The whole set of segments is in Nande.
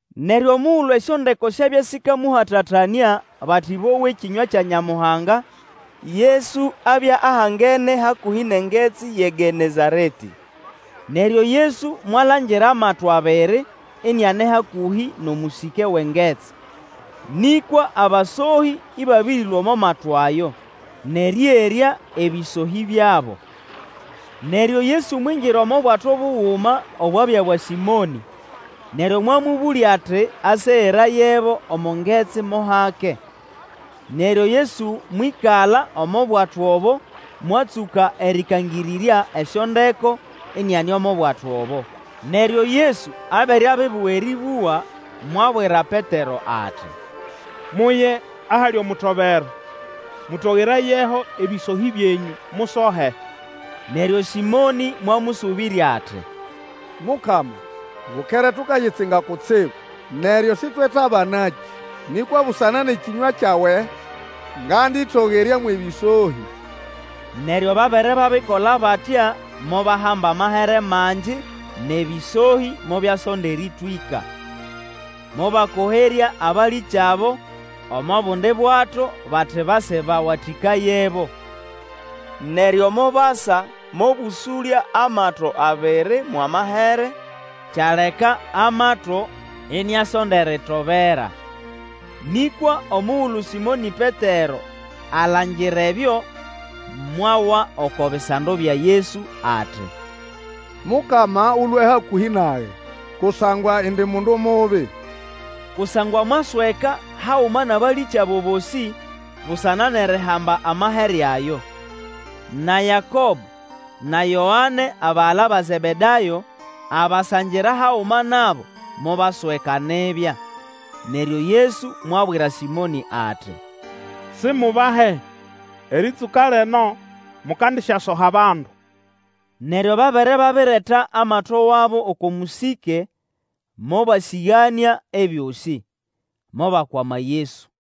Neryo omugulu esyondeko syabya sikamũhatatanĩa bati bowe ekĩnywa kya Nyamuhanga, Yesu abya ahangene hakũhĩ nʼengetsi yʼeGenezaretĩ. Neryo Yesu mwalangira amato abiri iniane hakũhĩ nʼomũsĩke wʼengetsi; nĩkwa abasohĩ ĩbabĩrĩlũa omo mato ayo, nʼerĩerya ebĩsohĩ byabo. Neryo Yesu mwingira omo bwato buguma obwabya bwa Sĩmonĩ, neryo mwamũbũlya ati asegerayebo omo ngetsi mo hake. Neryo Yesu mwĩkala omo bwato obo mwatsũka erĩkangĩrĩrya esyondeko, iniane omo bwato obo. Neryo Yesu abere abibuga erĩbũga, mwabwira Petero ati, Muye ahali omutobero, mũtogerayeho ebĩsohĩ byenyũ, musohe. Neryo Sĩmonĩ mwamũsũbĩrya ati, Mukama, bukere tukayitsinga kutsibu, neryo sĩtwetabanakĩ! Nĩkwa busana nʼekĩnywa kyawe ngandĩtogerya mwʼebĩsohĩ. Neryo babere babikola batya mobahamba amahere mangi nʼebĩsohĩ mobyasonda erĩtwĩka. Mobakoherya abalĩkyabo omo bundi bwato bati base bawatĩkayebo. Neryo mobasa mobũsũlya amato abiri mwʼamahere, kyaleka amato iniasonda eritobera. Nĩkwa omugulu Sĩmonĩ Petero alangira ebyo, mwawa oko bisando bya Yesu ati, Mukama Ũlũe hakũhĩ nage, kusangwa indi mundu mubi. Kusangwa mwasweka haguma nʼabalĩkyabo bosĩ busana nʼerihamba amahere ayo. Na Yakobo na Yoane, abagala ba Zebedayo, abasangira haguma nabo mobasweka nibya. Neryo Yesu mwabwira Sĩmonĩ ati, Sigubahe, erĩtsũka lino mukandisyasoha abandu. Neryo babere babireta amato wabo oko mũsĩke, mobasĩganĩa ebyosĩ, mobakwama Yesu.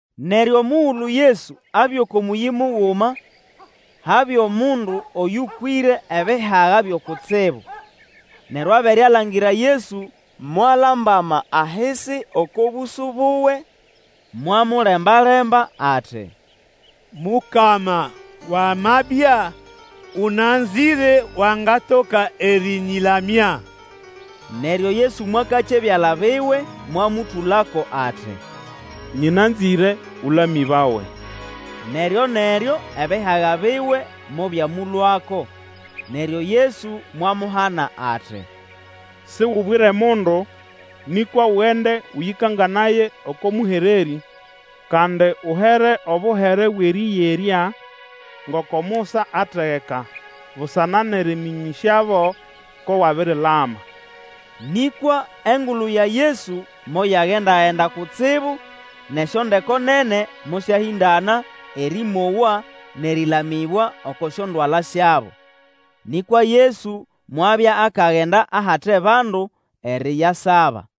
Neryo omugulu Yesu abya oko mũyĩ muguma, habya omundu oyũkwĩre ebihaga byo kutsibu; neryo abere alangira Yesu, mwalambama ahisi oko bũsũ buwe, mwamulemba-lemba ati, Mukama, wamabya, ũnanzĩre wangatoka erĩnyĩlamya. Neryo Yesu mwakakya ebyala biwe mwamũtũlako ati, Nyĩnanzĩre; ũlamĩbawe, neryo-neryo ebihaga biwe mobyamũlũako. Neryo Yesu mwamuhana ati, Sigubwire mundu, nĩkwa ugende ũyĩkanganaye oko mũhererĩ, kandi uhere obuhere bwʼerĩyerya ngoko Musa ategeka, busana nʼerĩmĩnyĩsyabo ko wabirilama. Nĩkwa engulu ya Yesu moyagenda-genda kutsibu, nʼesyondeko nene mosyahĩndana erĩmowa nʼerĩlamĩbwa oko syondwala syabo. Nĩkwa Yesu mwabya akagenda ahate bandu eriyasaba.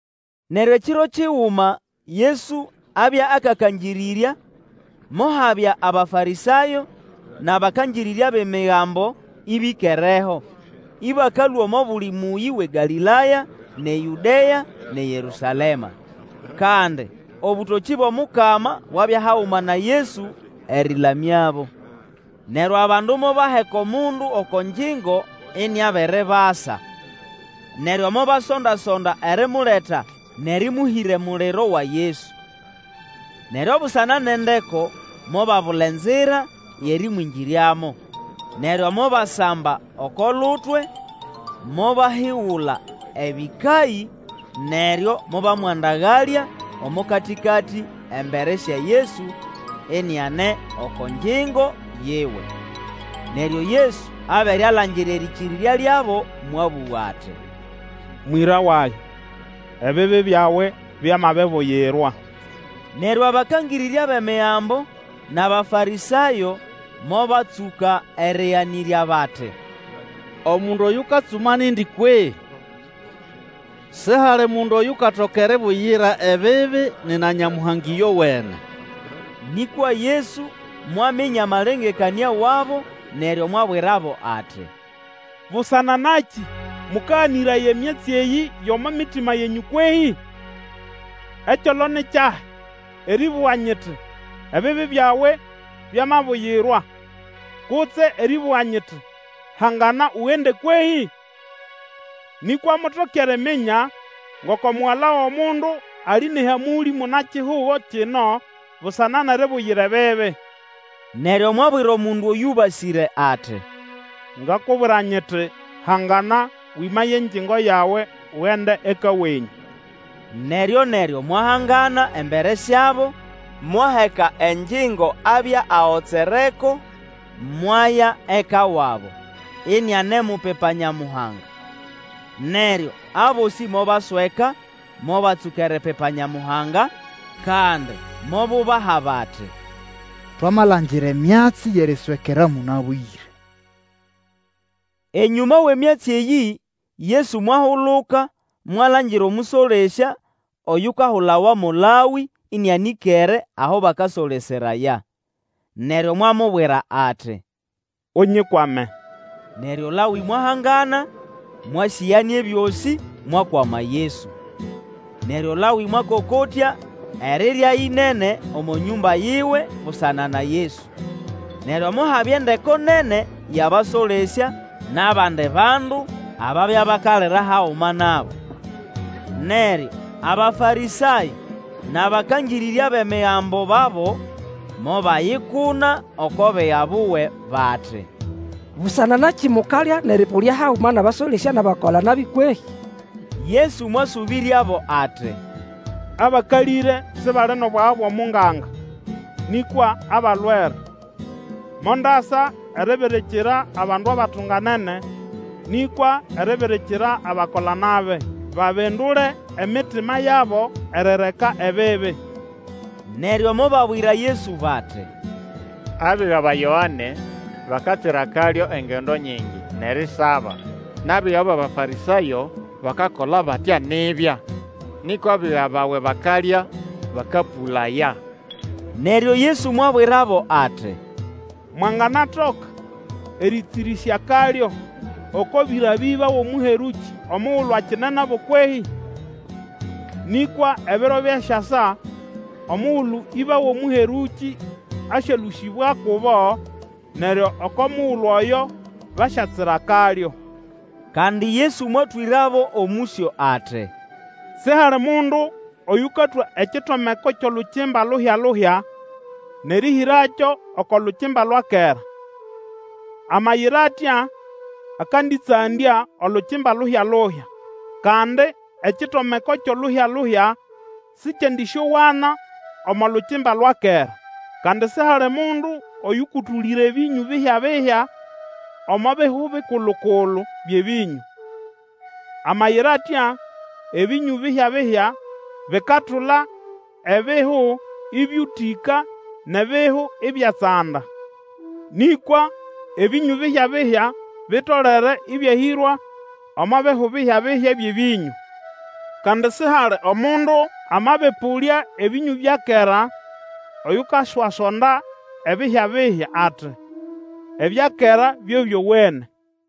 Neryo ekiro kiguma Yesu abya akakangĩrĩrya, mohabya Abafarĩsayo nʼabakangĩrĩrya bʼEmigambo ĩbĩkereho, ĩbakalũa omo buli mũyĩ wʼeGalĩlaya nʼeYũdea nʼeYerũsalema. Kandi obũtokĩ bwʼomukama bwabya haguma na Yesu erĩlamyabo. Neryo abandu mobaheka omundu oko ngyingo iniabiribasa. Neryo mobasonda-sonda erimuleta nʼerĩmũhĩra emuliro wa Yesu. Neryo busana nʼendeko, mobabula enzira yʼerĩmwĩngĩryamo. Neryo mobasamba oko lutwe, mobahigula ebĩkayĩ, neryo mobamwandagalya omo katĩkatĩ embere sya Yesu iniane oko ngyingo yiwe. Neryo Yesu abere alangira erĩkĩrĩrya lyabo mwabũga ati, Mwĩra wage, ebibi byawe byamabibuyirwa. Neryo abakangĩrĩrya bʼEmigambo nʼAbafarĩsayo mobatsũka erĩganĩrya bati, Omundu oyukatsuma nindi kwehĩ? Sihali mundu oyukatoka eribuyira ebibi nina Nyamuhanga ĩyowene! Nĩkwa Yesu mwaminya amalengekanĩa wabo, neryo mwabwirabo ati, Busana nakĩ mũkaganĩraya emyatsi eyĩ yʼomo mitima yenyũ kwehĩ? Ekyolo ni kyahi, erĩbũga, nyiti, Ebibi byawe byamabuyirwa, kutse erĩbũga nyiti, Hangana ugende, kwehĩ? Nĩkwa mutoke eriminya ngoko Mugala wʼomundu ali nʼehamũlĩ muna-kihugo kino busana nʼeribuyira ebibi, neryo mwabwira omundu oyũbasĩre ati, Ngakubwira nyiti, Hangana, wĩmaye engyingo yawe ugende eka wenyũ. Neryo-neryo mwahangana embere syabo, mwaheka engyingo abya agotsereko, mwaya eka wabo, inianemupipa Nyamuhanga. Neryo abosĩ mobasweka, mobatsũka eripipa Nyamuhanga; kandi mobubaha bati, Twamalangira emyatsi yʼeriswekera mũnabwĩre. Enyũma wʼemyatsi eyĩ, Yesu mwahuluka mwalangira omũsolesya oyukahulawa mo Lawĩ ĩnĩanĩkere aho bakasoleseraya. Neryo mwamubwira ati, Unyikwame Neryo Lawĩ mwahangana, mwasĩganĩa ebyosĩ, mwakwama Yesu. Neryo Lawĩ mwakokotya erirya ĩnene omo nyũmba yiwe busana na Yesu. Neryo mohabya endeko nene yʼabasolesya nʼabandi bandu ababya bakalira haguma nabo. Neryo Abafarĩsayo nʼabakangĩrĩrya bʼEmigambo babo mobayikuna oko biga buwe, bati, Busana nakĩ mukalya nʼerĩpũlya haguma nʼabasolesya nʼabakola-nabi kwehĩ? Yesu mwasũbĩryabo ati, Abakalĩre sibali nʼobwaga bwʼomunganga, nĩkwa abalwere. Mondasa eribirikira abandu batunganene, nĩkwa eribirikira abakola-nabi, babindule emitima yabo erireka ebibi. Neryo mobabwira Yesu bati, Abiga ba Yoane, bakatsira akalyo engendo nyingi, nʼerisaba; nʼabiga bʼAbafarĩsayo bakakola batya nibya; nĩkwa abiga bawe bakalya, bakapũlaya. Neryo Yesu mwabwirabo ati, Mwanganatoka erĩtsĩrĩsya akalyo oko bĩra bʼĩba wʼomũherũkĩ omugulu akine nabo kwehĩ? Nĩkwa ebiro byasyasa omugulu ĩba wʼomũherũkĩ asyalũsĩbwa kubo, neryo oko mugulu oyo basyatsira akalyo. Kandi Yesu mwatwĩrabo omũsyo ati, Sihali mundu oyũkatwa ekitomeko kyʼolukimba luhya-luhya, nʼerĩhĩrakyo oko lukimba lwa kera. Amayira atya akandĩtsandya olukimba luhya-luhya. Kandi ekitomeko kyʼoluhya-luhya sĩkyendĩsyowana omo lukimba lwa kera. Kandi sihali mundu oyũkũtũlĩra ebĩnyũ bihyabihya omo bihu bikulu-kulu byʼebĩnyũ. Amayira atya, ebĩnyũ bihya-bihya bikatula ebihu ĩbyũtĩka, nʼebihu ibyatsanda. Nĩkwa ebĩnyũ bihya-bihya bitolere ĩbyahĩrwa omo bihu bihya-bihya byʼebĩnyũ. Kandi sihali omundu amabĩpũlya ebĩnyũ bya kera oyukaswasonda ebihyabihya; ati, Ebya kera byo byowene.